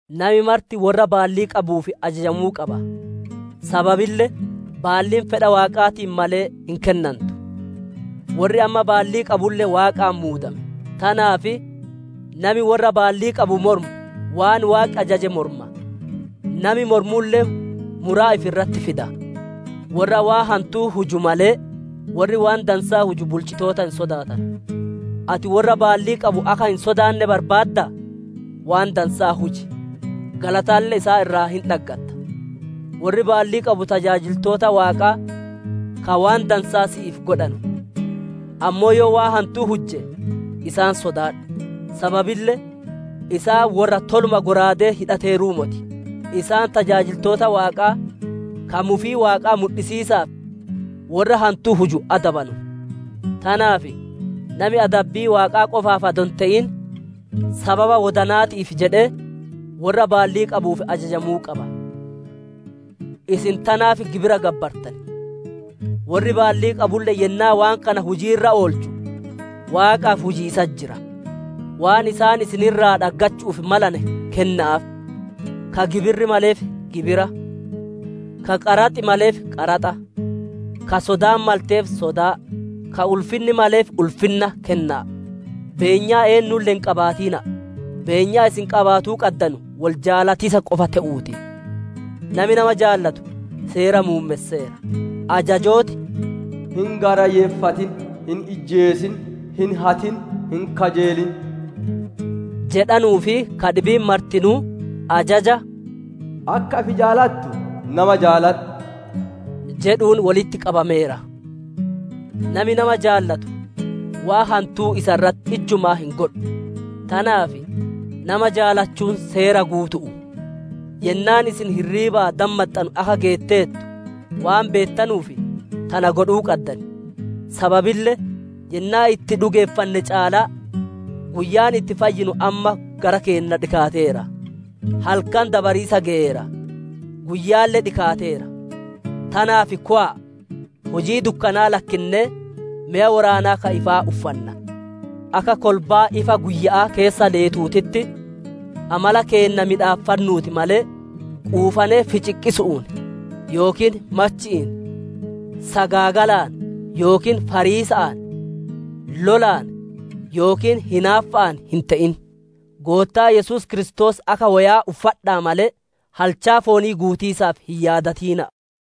Nami marti worra baallii qabuuf ajajamuu qaba! Sababille baalliin fedha Waaqaatiin malee, hin kennantu; worri amma baallii qabulle Waaqaan muudame. Tanaaf nami worra baallii qabu mormu, waan Waaqi ajaje morma; nami mormulle muraa ifi irratti fida. Worra waan hantuu huju malee, worri waan dansaa huju bulchitoota hin sodaatanu. Ati worra baallii qabu akka hin sodaanne barbaaddaa? Waan dansaa huji; galatalle isaan irraa hin dhaggatta. Worri baallii qabu tajaajiltoota Waaqaa ka waan dansaa si'iif godhanu. Ammoo yoo waan hantuu hujje, isaan sodaadhu; sababille isaan worra toluma shallaagaa hidhateeruu moti. Isaan tajaajiltoota Waaqaa, ka mufii Waaqaa mudhisiisaaf, worra hantuu huju adabanu. Tanaaf nami adabbii Waaqaa qofaaf adoo hin te'in, sababa wodana'aatiif jedhee worra baallii qabuuf ajajamuu qaba. Isin tanaaf gibiralle gabbartan; worri baallii qabulle yennaa waan kana hujii irra oolchu Waaqaaf hujiisatti jira. Waan isaan isin irraa dhaggachu'uuf malane, kenna'aaf; ka gibirri maleef gibira, ka qaraxi maleef qaraxa, ka sodaan malteef sodaa, ka ulfinni maleef ulfinna kenna'a. Beenyaa eennuulle hin qabaatina'a; beenyaan isin qabaatuu qaddanu wol jaalatiisa qofa te'uu ti; nami nama jaalatu Seera muummesseera. Ajajooti, «Hin gaarayyeeffatin; hin ijjeesin; hin hatin; hin kajeelin» jedhanuu fi ka dhibiin martinuu, ajaja, «Akka ifi jaalattu nama jaaladhu» jedhuun wolitti qabameera. Nami nama jaalatu, waan hantuu isa irratti ijjumaa hin godhu; tanaaf, nama jaalachuun Seera guutu'u. Yennaan isin hirriibaa dammaxxanu akka geetteertu waan beettanuuf, tana godhuu qaddan. Sababille yennaa itti dhugeeffanne caalaa guyyaan itti fayyinu amma gara keenna dhikaateera. Halkan dabariisa geyeera; guyyaalle dhikaateera. Tanaaf kowa'a hujii dukkanaa lakkinnee, meya woraanaa ka ifaa uffanna. Akka kolbaa ifa guyya'aa keessa leetuutitti, amala keenna miidhaffannuu ti malee, quufanee ficiqqisu'uun yookiin machi'iin, sagaagalaan yookiin fariisa'aan, lolaan yookiin hinaaffa'aan hin te'in. Goottaa Yesuus Kiristoos akka woya'aa uffadha'a malee, halchaa foonii guutatiisaaf hin yaadatina'a.